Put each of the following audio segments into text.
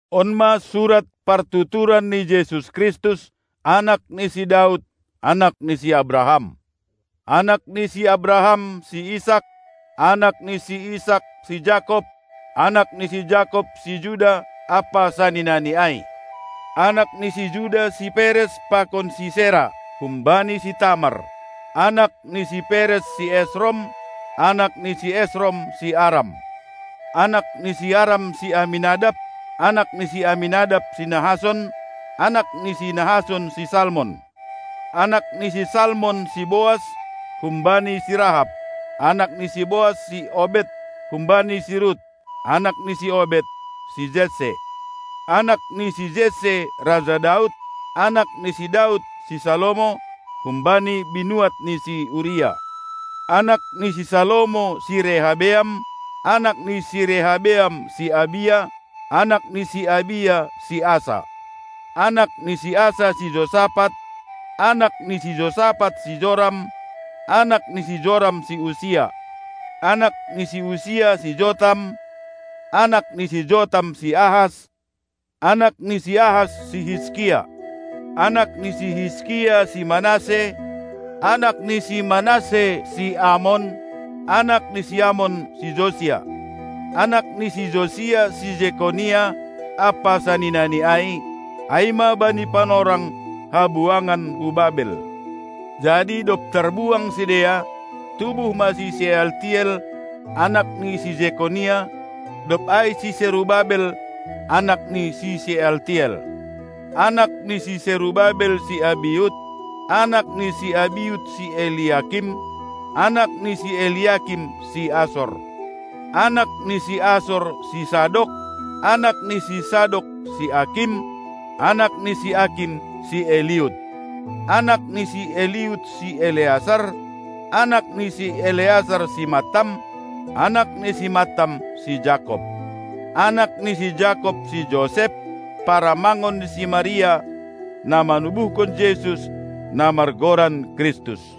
On ma surat partuturan ni Jesus Kristus, anak ni si Daud, anak ni si Abraham. Anak ni si Abraham si Isak; anak ni si Isak si Jakob; anak ni si Jakob si Juda ampa saninani ai. Anak ni si Juda si Peres pakon si Sera, humbani si Tamar; anak ni si Peres si Esrom; anak ni si Esrom si Aram. Anak ni si Aram si Aminadab; anak ni si Aminadab si Nahason; anak ni si Nahason si Salmon. Anak ni si Salmon si Boas humbani si Rahab; anak ni si Boas si Obed humbani si Rut; anak ni si Obed si Jesse. Anak ni si Jesse raja Daud; anak ni si Daud si Salomo, humbani binuat ni si Uria. Anak ni si Salomo si Rehabeam; anak ni si Rehabeam si Abia; anak ni si Abia si Asa. Anak ni si Asa si Josapat; anak ni si Josapat si Joram; anak ni si Joram si Usia. Anak ni si Usia si Jotam; anak ni si Jotam si Ahas; anak ni si Ahas si Hiskia. Anak ni si Hiskia si Manasse; anak ni si Manasse si Amon; anak ni si Amon si Josia. Anak ni si Josia si Jekonya ampa saninani ai, ai ma bani panorang habuangan hu Babel.. Jadi dob tarbuang sidea, tubuh ma si Sealtiel, anak ni si Jekonya, dob ai si Serubabel, anak ni si Sealtiel. Anak ni si Serubabel si Abiud; anak ni si Abiud si Eliakim; anak ni si Eliakim si Asor. Anak ni si Asor si Sadok; anak ni si Sadok si Akim; anak ni si Akim si Eliud. Anak ni si Eliud si Eleasar; anak ni si Eleasar si Mattam; anak ni si Mattam si Jakob. Anak ni si Jakob si Josep, paramangon ni si Maria, na manubuhkon Jesus, na margoran Kristus.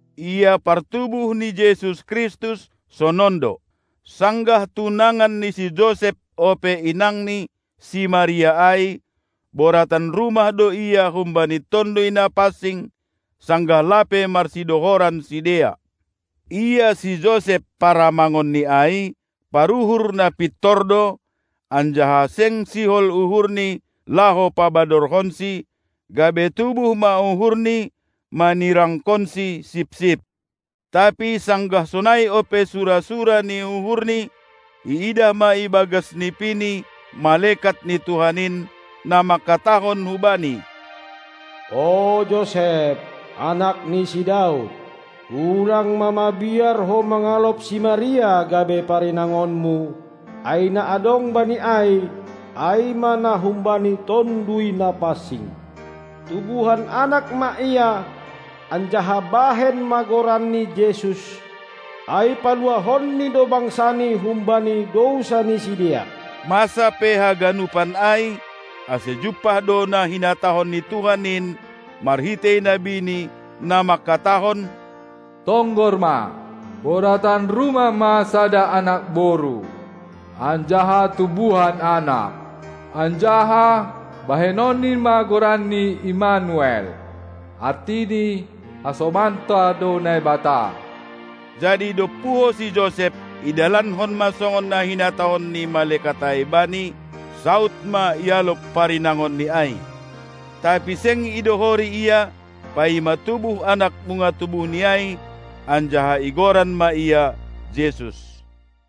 Ia partubuh ni Jesus Kristus, sonon do: Sanggah tunangan ni si Josep ope inangni, si Maria ai, boratan rumah do ia humbani Tonduy Napansing, sanggah lape marsidohoran sidea. Ia si Josep, paramangonni ai, paruhur na pintor do, anjaha seng sihol uhurni laho pabadorhonsi, gabe tubuh ma uhurni manirangkonsi sipsip. Tapi sanggah sonai ope sura-sura ni uhurni, iidah ma ibagas nipini malekat ni Tuhan in, na mangkatahon hubani: O Josep, anak ni si Daud, ulang ma mabiar ho mangalop si Maria gabe parinangonmu, ai na adong bani ai, ai ma na humbani Tonduy Napansing. Tubuhan Anak ma ia, anjaha bahen ma goranni Jesus, ai paluahonNi do bangsaNi humbani dousa ni sidea. Masa pe haganupan ai, ase jumpah do na hinatahon ni Tuhan in marhitei nabiNi, na mangkatahon: Tonggor ma, boratan rumah ma sada anak boru, anjaha tubuhan anak, anjaha bahenonni ma goranni Immanuel, artini: Hasomanta do Naibata. Jadi dob puho si Josep, idalankon ma songon na hinatahon ni malekat ai bani, saud ma ialop parinangonni ai. Tapi seng idohori ia, paima tubuh anak bunga tubuhni ai, anjaha igoran ma ia Jesus.